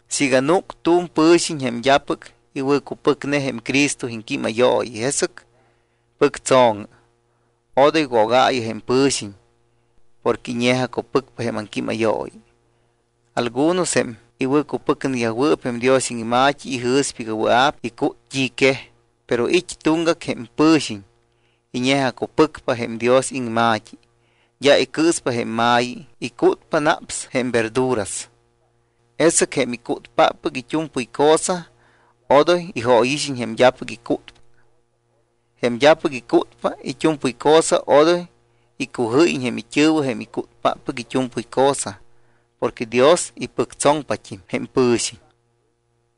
Siiga núc tu̱m pɨ̱xiñ jém d́apɨc iwɨ̱cupɨcne jém Cristo iŋquímayooyi, jesɨc pɨctso̱ŋɨ. Odoy wogaayɨ jém pɨ̱xiñ porque iñe̱jacupɨcpa jém aŋquímayooyi. Algunos jém iwɨ̱cupɨcneyajwɨɨp jém Dios iŋma̱t́i ijɨ̱spa iga wɨa̱p icút t́i quej. Pero it́ tuŋgac jém pɨ̱xiñ iñe̱jacupɨcpa jém Dios iŋma̱t́i, d́a icɨɨspa jém ma̱yi, icútpa naps jém verduras. Jesɨc jém icútpáppɨc it́u̱mpɨy cosa odoy ijóyixiñ jém d́apɨc icútpa. Jém d́apɨc icútpa it́u̱mpɨy cosa, odoy icujɨ́yiñ jém it́ɨ̱wɨ jém icútpáppɨc it́u̱mpɨy cosa porque Dios ipɨctsoŋpat́im jém pɨ̱xiñ.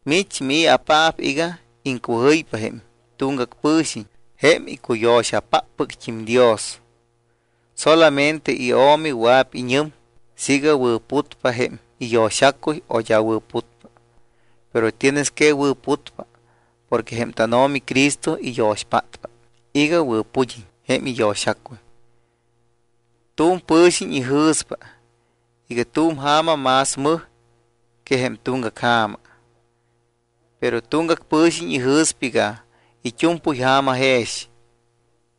¿Mich mii̱apaap iga iŋcujɨypa jém tuŋgac pɨ̱xiñ jém icuyo̱xapáppɨct́im Dios? Solamente iO̱mi wɨa̱p iñɨm siiga wɨ̱putpa jém iyo̱xacuy o d́a wɨ̱putpa. Pero tienes que wɨ̱putpa porque jém tánO̱mi Cristo iyo̱xpátpa iga wɨ̱pud́iñ jém iyo̱xacuy. Tu̱m pɨ̱xiñ ijɨ̱spa iga tu̱m ja̱ma más mɨj que jém tuŋgac ja̱ma. Pero tuŋgac pɨ̱xiñ ijɨ̱spa iga it́u̱mpɨy ja̱ma jex.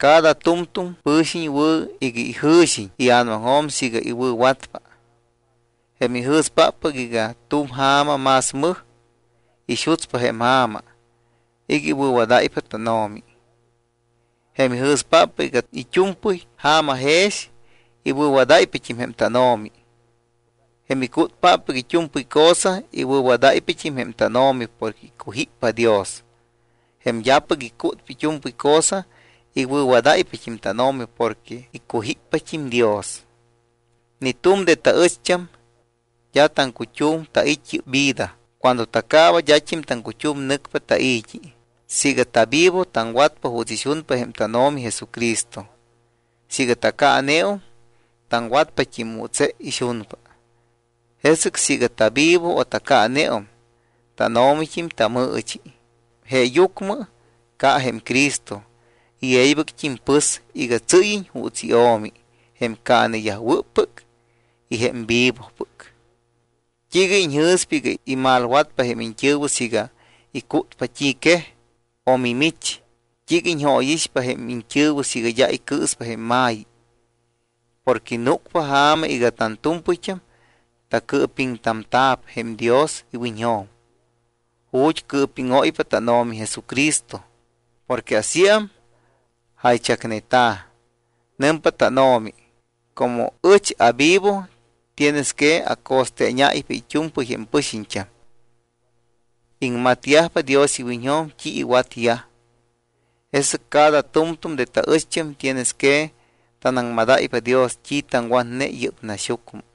Cada tu̱mtu̱m pɨ̱xiñ wɨ̱ iga ijɨ̱xiñ ia̱namaŋjo̱m siiga iwɨ̱watpa. Jém ijɨ̱spáppɨc iga tu̱m ja̱ma más mɨj, ixutspa jém ja̱ma iga iwɨ̱wadáypa tánO̱mi. Jém ijɨ̱spáppɨc iga it́u̱mpɨy ja̱ma jex, iwɨ̱wadáypat́im jém tánO̱mi. Jém icútpáppɨc it́u̱mpɨy cosa, iwɨ̱wadáypat́im jém tánO̱mi porque icujíppa Dios. Jém d́apɨc icútpa it́u̱mpɨy cosa, iwɨ̱wadáypat́im tánO̱mi porque icujíppat́im Dios. Ni tu̱m de taɨcht́am d́a taŋcut́um tait́ yɨ́p vida, cuando tacaaba d́at́im taŋcut́um nɨcpa tai̱t́i. Siiga tavivo taŋwatpa juuts ixunpa jém tánO̱mi Jesucristo. Siiga tacaaneum, taŋwatpat́im juuts je ixunpa. Jesɨc siiga tavivo o tacaaneum, tánO̱mit́im tamɨɨchi. Jeeyucmɨ ca jém Cristo y e̱ybɨct́im pɨs iga tsɨ́yiñ juuts iO̱mi jém caaneyajwɨ́ppɨc y jém vivopɨc. ¿T́iiga iñjɨ̱spa iga imalwatpa jém iñt́ɨ̱wɨ siiga icútpa t́i quej? ¿O mimich, t́iiga iñjóyixpa jém iñt́ɨ̱wɨ siiga d́a icɨɨspa jém ma̱yi? Porque núcpa ja̱ma iga tantu̱mpɨyt́am tacɨɨpiŋtamta̱p jém Dios iwiñjo̱m ju̱t́ cɨɨpíŋóypa tánO̱mi Jesucristo. Porque asíam jaychacneta̱: Nɨmpa tánO̱mi: “Como ɨch avivo tienes que aco̱steeñáypa it́u̱mpɨy jém pɨxiñt́am, iŋmatyajpa Dios iwiñjo̱m t́i iwatyaj.” Jesɨc cada tu̱mtu̱m de taɨcht́am tienes que tanaŋmadáypa Dios t́i taŋwatne yɨ́p naxyucmɨ.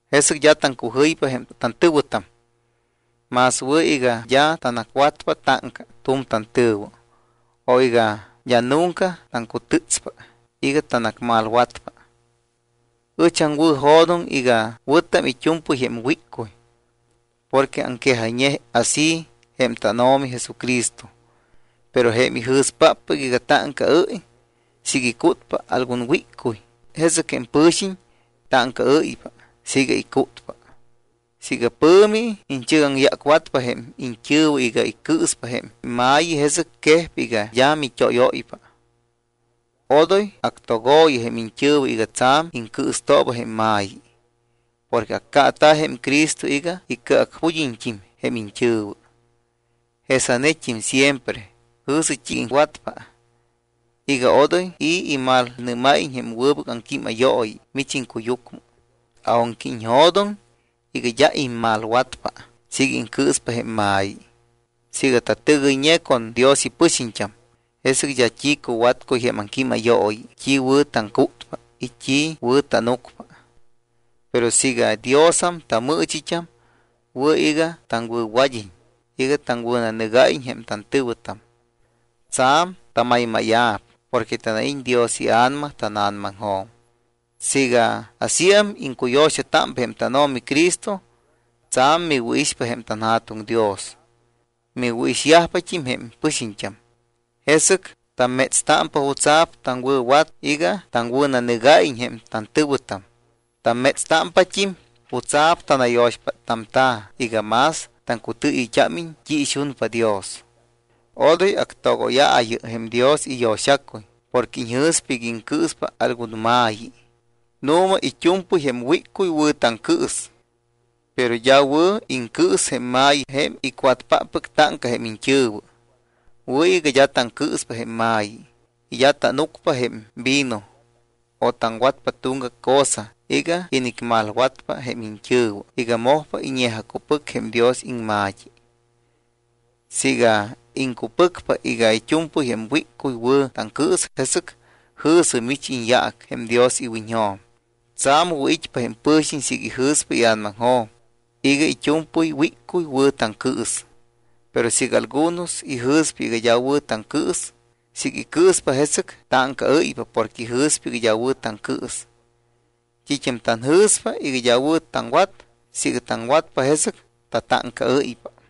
Jesɨc d́a taŋcujɨypa jém tantɨ̱wɨtam. Más wɨ̱ iga d́a tanacwatpa táŋca tu̱m tantɨ̱wɨ o iga d́a nunca taŋcutɨtspa iga tanacmalwatpa. Ɨch aŋwɨ̱jo̱doŋ iga wɨ̱tam it́u̱mpɨy jém wíccuy porque aŋquejayñe así jém tánO̱mi Jesucristo. Pero jém ijɨ̱spáppɨc iga táŋcaɨ́y siiga icútpa algun wíccuy, jesɨc jém pɨ̱xiñ táŋcaɨ́ypa siiga icútpa. Siiga pɨ̱mi iñchɨgaŋyácwatpa jém iñt́ɨ̱wɨ iga iŋcɨɨspa jém ma̱yi, jesɨc quejpa iga d́a mit́óyóypa. Odoy actogo̱yɨ jém iñt́ɨ̱wɨ iga tsa̱m iŋcɨɨstooba jém ma̱yi porque accaata̱ jém Cristo iga icɨacpud́iñt́im jém iñt́ɨ̱wɨ. Jesanet́im siempre jɨ̱sɨ t́i iŋwatpa iga odoy i̱ imalnɨ́máyiñ jém wɨbɨc aŋquímayooyi mich iŋcuyucmɨ, aunque iñjo̱doŋ iga d́a immalwatpa siiga iŋcɨɨspa jém ma̱yi. Siiga tatɨgɨyñe con Dios ipɨxiñt́am, jesɨc d́a t́i cuwatcuy jém aŋquímayooyi t́i wɨ̱ taŋcútpa y t́i wɨ̱ tánucpa. Pero siiga Diosam tamɨɨchit́am, wɨ̱ iga taŋwɨ̱wad́iñ y iga taŋwɨ̱nanɨgáyiñ jém tantɨ̱wɨtam. Tsa̱m tamaymáya̱p porque tanait́ Dios iA̱nama tána̱namaŋjo̱m. Siiga asíam iŋcuyo̱xatámpa jém tánO̱mi Cristo, tsa̱m miwɨ̱ixpa jém tanJa̱tuŋ Dios, miwɨ̱ixyajpat́im jém pɨxiñt́am. Jesɨc tammétstámpa jutsa̱p taŋwɨ̱wat iga taŋwɨ̱nanɨgáyiñ jém tantɨ̱wɨtam. Tammétstámpat́im jutsa̱p tanayo̱xpáttamta̱ iga más taŋcutɨɨyɨyt́ámiñ t́i ixunpa Dios. Odoy actogóyaayɨ jém Dios iyo̱xacuy porque iñjɨ̱spa iga iŋcɨɨspa algun ma̱yi. Nu̱ma it́u̱mpɨy jém wíccuy wɨ̱ taŋcɨɨs. Pero d́a wɨ̱ iŋcɨɨs jém ma̱yi jém icwatpáppɨc táŋca jém iñt́ɨ̱wɨ. Wɨ̱ iga d́a taŋcɨɨspa jém ma̱yi y d́a tánucpa jém vino o taŋwatpa tuŋgac cosa iga inicmalwatpa jém iñt́ɨ̱wɨ iga mojpa iñe̱jacupɨc jém Dios iŋma̱t́i. Siiga iŋcupɨcpa iga it́u̱mpɨy jém wíccuy wɨ̱ taŋcɨɨs, jesɨc jɨ̱sɨ mich iñyaac jém Dios iwiñjo̱m. Tsa̱m wɨ̱it́pa jém pɨ̱xiñ siiga ijɨ̱spa ia̱namaŋjo̱m iga it́u̱mpɨy wíccuy wɨ̱ taŋcɨɨs. Pero siiga algunos ijɨ̱spa iga d́a wɨ̱ taŋcɨɨs, siiga icɨɨspa, jesɨc táŋcaɨ́ypa porque ijɨ̱spa iga d́a wɨ̱ taŋcɨɨs. T́it́am tanjɨ̱spa iga d́a wɨ̱ taŋwat siiga taŋwatpa, jesɨc tatáŋcaɨ́ypa.